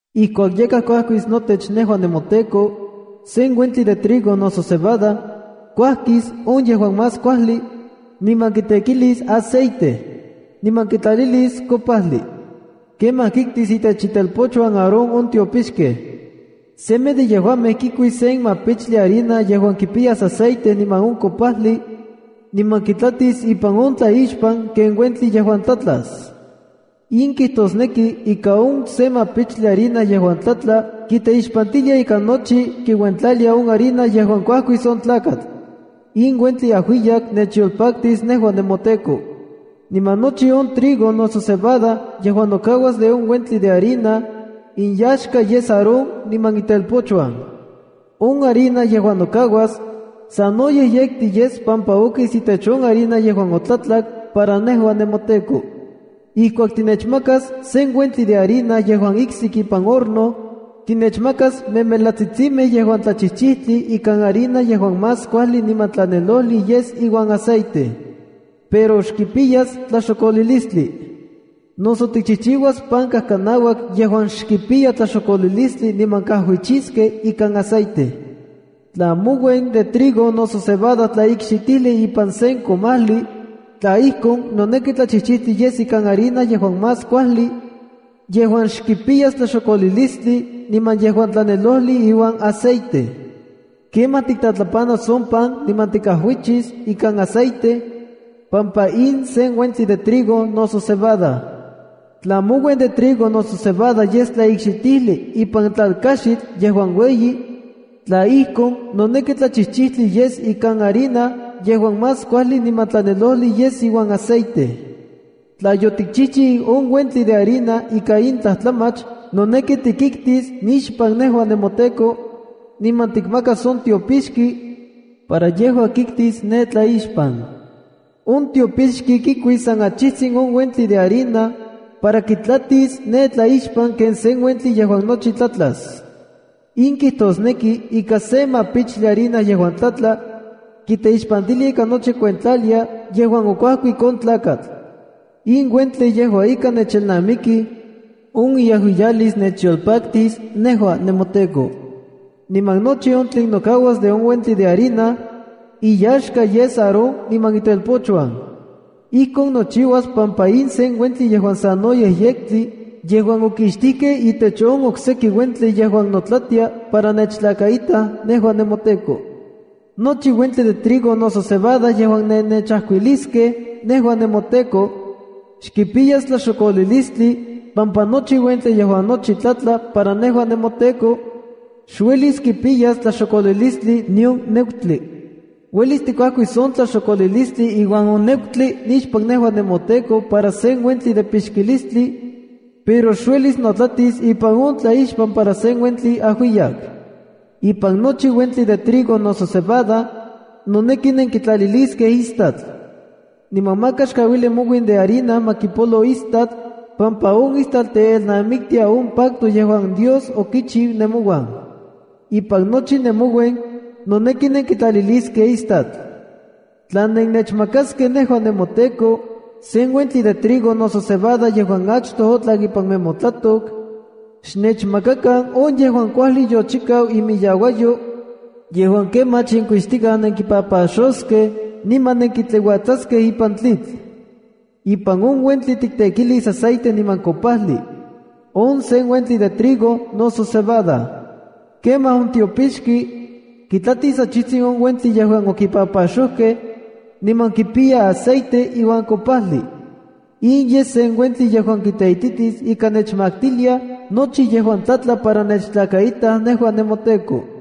’Ijkuak yakaj kuajkis notech nejua nemoTEKO, sen uentli de trigo noso cebada, kuajkis on yejuan más kuajli, niman kitekilis aceite, niman kitlalilis kopajli. Kemaj kiktis itech itelpochuan Aarón on tiopixkej. Semej de yejuamej kikuis se mapichtli harina yejuan kipiya aceite niman on kopajli, niman kitlatis ipan on tlaixpan ken uentli yejuan tlatlas. In kijtosneki ika on se mapichtli harina yejuan tlatla kiteixpantilia ika nochi kiuentlalia on harina yejuan okuajkik on tlakatl. In uentli ajuiyak nechyolpaktis nejua nemoTEKO. Niman nochi on trigo noso cebada yejuan nokauas de on uentli de harina, inyaxka yes Aarón niman itelpochuan. On harina yejuan nokauas, sanoyej yektli yes pampa okis itech on harina yejuan otlatlak, para nejua nemoTEKO. ’Ijkuak tinechmakas sen uentli de harina yejuan iksik ipan horno, tinechmakas memelatsitsimej yejuan tlachijchijtli ikan harina yejuan más kuajli niman tlanelojli yes iuan aceite. Pero xkipiyas tlaxokolilistli. Noso tikchijchiuas pan kajkanauak yejuan xkipiya tlaxokolilistli niman kajuichiskej ikan aceite. ’Tla mouen de trigo noso cebada tlaikxitijli ipan sen komajli, tla ijkon, noneki tlachijchijtli yes ikan harina yejuan más kuajli, yejuan xkipiyas tlaxokolilistli niman yejuan tlanelojli iuan aceite. Kemaj tiktlatlapanas on pan niman tikajuichis ikan aceite, pampa in sen uentli de trigo noso cebada. ’Tla mouen de trigo noso cebada yes tlaikxitijli ipan tlalkajxitl yejuan ueyi, tla ijkon, noneki tlachijchijtli yes ika harina yejuan más kuajli niman tlanelojli yes iuan aceite. Tla yotikchijchiu on uentli de harina ika in tlajtlamach, noneki tikiktis nixpan nejua nemoTEKO, niman tikmakas on tiopixki, para yejua kiktis ne tlaixpan. On tiopixki kikuis san achijtsin on uentli de harina para kitlatis ne tlaixpan ken sen uentli yejuan nochi tlatlas. In kijtosneki ika se mapichtli harina yejuan tlatla, kiteixpantilia ika nochi kiuentlalia yejuan okuajkik on tlakatl. In uentli yejua ika nechelnamikij, on iajuiyalis nechyolpaktis nejua nemoTEKO. Niman nochi on tlen nokauas de on uentli de harina, iyaxka yes Aarón niman itelpochuan. Ijkon nochiuas pampa in sen uentli yejuan sanoyej yektli yejuan okixtikej itech on okseki uentli yejuan notlatia para nechtlakaitaj nejua nemoTEKO. ’Nochi uentli de trigo noso cebada yejuan nennechajkuiliskej nejua nemoTEKO, xkipiyas tlaxokolilistli pampa nochi uentli yejuan nochi tlatla para nejua nemoTEKO, xuelis kipiyas tlaxokolilistli nion nekutli. Uelis tikuajkis on tlaxokolilistli iuan on nekutli nixpan nejua nemoTEKO para sen uentli de pixkilistli, pero xuelis notlatis ipan on tlaixpan para sen uentli ajuiyak. ’Ipan nochi uentli de trigo noso cebada, noneki nenkitlaliliskej istatl. Niman maka xkauili mouen de harina ma kipolo istatl pampa on istatl teelnamiktia on pacto yejuan Dios okichiu nemouan. Ipan nochi nemouen, noneki nenkitlaliliskej istatl. ’Tla nennechmakaskej nejua nemoTEKO sen uentli de trigo noso cebada yejuan achtoj otlak ipan nemotlatok, xnechmakakan on yejuan kuajli yochikau imiyauayo, yejuan kemach yenkuixtikaj nenkipapaxoskej niman nenkitliuatsaskej ipan tlitl. Ipan on uentli tiktekilis aceite niman kopajli. On sen uentli de trigo noso cebada. Kemaj on tiopixki, kitlatis achijtsin on uentli yejuan okipapaxojkej, niman kipiya aceite iuan kopajli. In yes sen uentli yejuan kiteititis ika nechmaktiliaj nochi yejuan tlatla para nechtlakaitaj nejua nemoTEKO.